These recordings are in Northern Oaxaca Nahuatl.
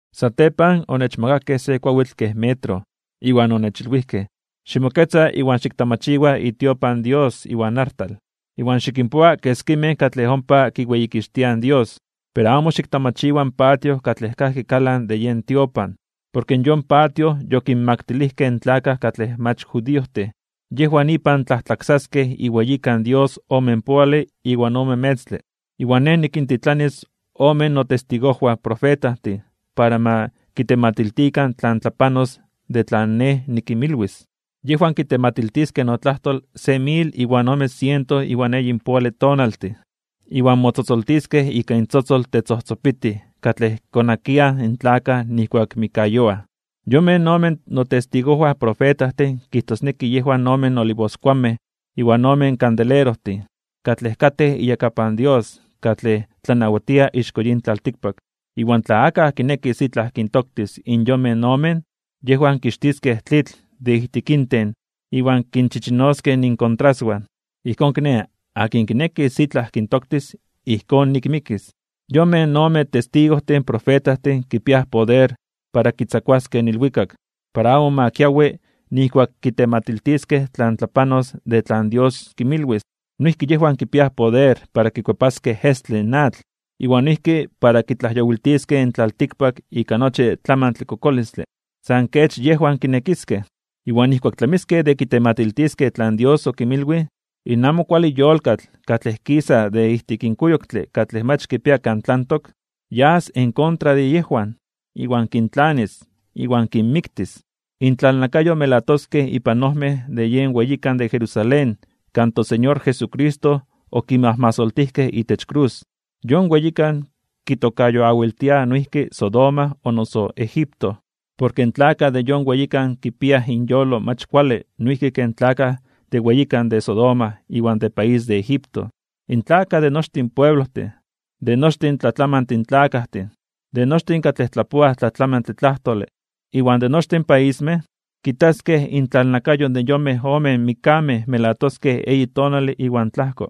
Satepan onechmakakej se kuawitl kej metro, iwan onechilwijkej: ―Ximoketza iwan xiktamachiwa itiopan Dios iwan artal. Iwan xikinpoa keskimej katlej ompa kiweyikixtiaj in Dios. Pero amo xiktamachiwa in patio katlej kajki kalan de yen tiopan, porke yon patio yokinmaktilijkej in tlakaj katlej mach judiojtin. Yejwan ipan tlajtlaksaskej iweyikan Dios omenpoale iwan ome metztle. Iwan nej nikintitlanis ome notestigojwan profetajtin para ma kitematiltikan tlan tlapanos de tlan nej nikinmilwis. Yejwan kitematiltiskej notlajtol se mil iwan ome siento iwan eyinpoale tonaltin, iwan motzotzoltiskej ika intzotzol tetzojtzopitij katlej konakiaj in tlakaj nijkuak mikkayoaj. Yonmej omen notestigojwan profetajtin kijtosneki yejwan ome olivoskuanmej iwan ome kandelerojtin, katlej katej iyakapan Dios katlej tlanawatia ixko yin tlaltikpak. Iwan tla akaj kinekis itlaj kintoktis in yonmej omen, yejwan kixtiskej tlitl de ijtik inten iwan kinchichinoskej inkontraswan. Ijkón kiné, akin kinekis itlaj kintoktis, ijkón nik mikis. Yonmej ome testigojtin profetajtin kipiaj poder para kitzakuaskej in ilwikak, para amo ma kiawi nijkuak kitematiltiskej tlan tlapanos de tlan Dios kinmilwis. Noijki yejwan kipiaj poder para kikuepaskej estle in atl, iwan noijki para kitlajyowiltiskej in tlaltikpak ika nochi tlamantle kokolistle, san kech yejwan kinekiskej. Iwan nijkuak tlamiskej de kitematiltiskej tlan Dios okinmilwij, in amo kuale yolkatl katlej kisas de ijtik in kuyoktle katlej mach kipia kan tlantok, yas en kontra de yejwan, iwan kintlanis, iwan kinmiktis. Intlalnakayo melatoskej ipan ojmej de yen weyikan de Jerusalén kan toSeñor Jesucristo okimajmasoltijkej itech krus. Yon weyikan kitokayoawiltiaj noijki Sodoma o noso Egipto. Porke in tlakaj de yon weyikan kipiaj inyolo mach kuale noijki ken tlakaj de weyikan de Sodoma iwan de país de Egipto. In tlakaj de nochtin pueblojtin, de nochi tlatlamantin tlakajtin, de nochtin katlej tlapoaj tlatlamantle tlajtole, iwan de nochtin paismej, kitaskej intlalnakayo de yonmej omen mikkamej melatoskej eyi tonale iwan tlajko,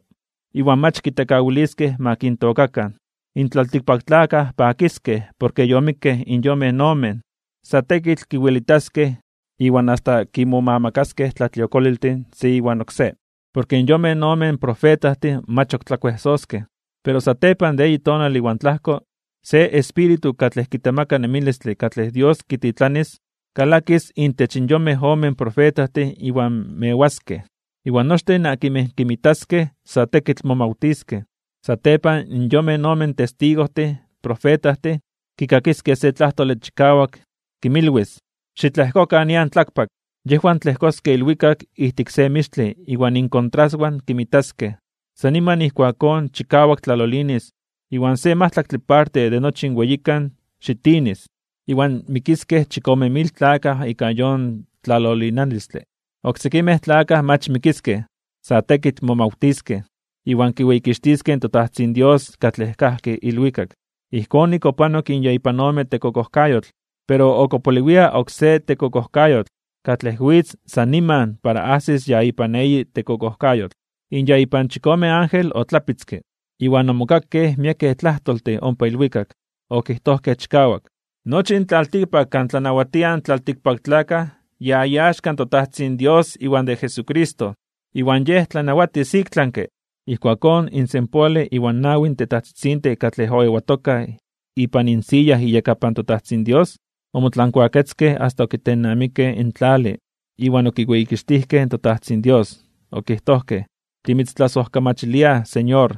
iwan mach kitekawiliskej ma kintookakan. In tlaltikpaktlakaj pakiskej porke yomikkej in yonmej omen, sa tekitl kiwelitaskej iwan asta kimomamakaskej tlatliokoliltin se iwan oksé, porke in yonmej omen profetajtin mach ok tlakuejsoskej. Pero satepan de eyi tonale iwan tlajko, se espíritu katlej kitemaka nemilistle katlej Dios kititlanis, kalakis intech in yonmej omen profetajtin iwan mewaskej. Iwan nochtin akinmej kinmitaskej sa tekitl momawtiskej. Satepan yonmej omen testigojtin profetajtin kikakiskej se tlajtole chikawak, kinmilwis: ―Xitlejkokan nian tlakpak. Yejwan tlejkoskej ilwikak ijtik se mixtle iwan inkontraswan kinmitaskej. San niman ijkuakón chikawak tlalolinis iwan se majtlaktle parte de nochi in weyikan xitinis, iwan mikiskej chikome mil tlakaj ika yon tlalolinalistle. Oksekimej katlej mach mikiskej, sa tekitl momawtiskej, iwan kiweyikixtiskej in toTajtzin Dios katlej kajki ilwikak. Ijkón nik opanok in ya ipan ome tekokojkayotl, pero ok opoliwia oksé tekokojkayotl katlej witz san niman para ajsis ya ipan eyi tekokojkayotl. In ya ipan chikome ángel otlapitzke, iwan omokakej miekej tlajtoltin ompa ilwikak, okijtojkej chikawak: Nochi in tlaltikpak kan tlanawatiaj in tlaltikpaktlakaj ya iaxka in toTajtzin Dios iwan de Jesucristo. Iwan Yej tlanawatis iktlanke (ik tlami). Ijkuakón in senpoale iwan nawi tetajtzitzintin katlej oewatokaj ipan insiya iyakapan toTajtzin Dios, omotlankuaketzkej asta okitennamikej in tlale iwan okiweyikixtijkej in toTajtzin Dios, okijtojkej: Timitztlasojkamachiliaj, Señor,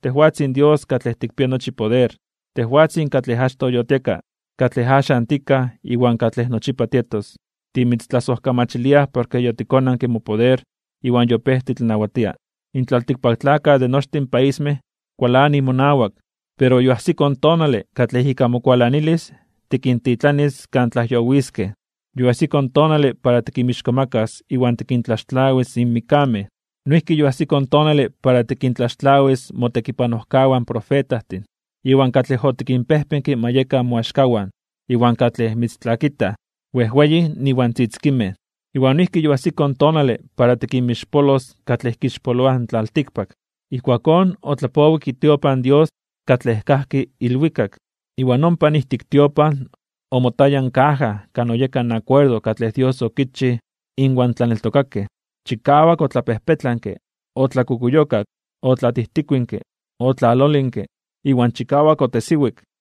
tejwatzin Dios katlej tikpia nochi poder, tejwatzin katlej achtoj yotieka, katlej axan tikaj iwan katlej nochipa tietos, timitztlasojkamachiliaj porke yotikonanke mopoder iwan yopéj titlanawatia. In tlaltikpaktlakaj de nochtin paismej kualanij monawak, pero yoajsiko in tonale katlej ika mokualanalis tikintitlanis kan tlajyowiskej, yoajsiko in tonale para tikinmixkomakas (tikintzonmanas) iwan tikintlaxtlawis in mikkamej. Noijki yoajsiko in tonale para tikintlaxtlawis motekipanojkawan profetajtin, iwan katlej otikinpejpenke ma yekan moaxkawan, iwan katlej mitztlakitaj, wejweyin iwan tzitzikinmej. Iwan noijki yoajsiko in tonale para tikinmixpolos katlej kixpoloaj in tlaltikpak. Ijkuakón otlapowik itiopan Dios katlej kajki ilwikak, iwan ompa ijtik tiopan omotaya in kaja kan oyeka in akuerdo katlej Dios okichij inwan itlaneltokakej. Chikawak otlapejpetlanke, otlakukuyokak, otlatijtikuinke, otlalolinke iwan chikawak otesiwik.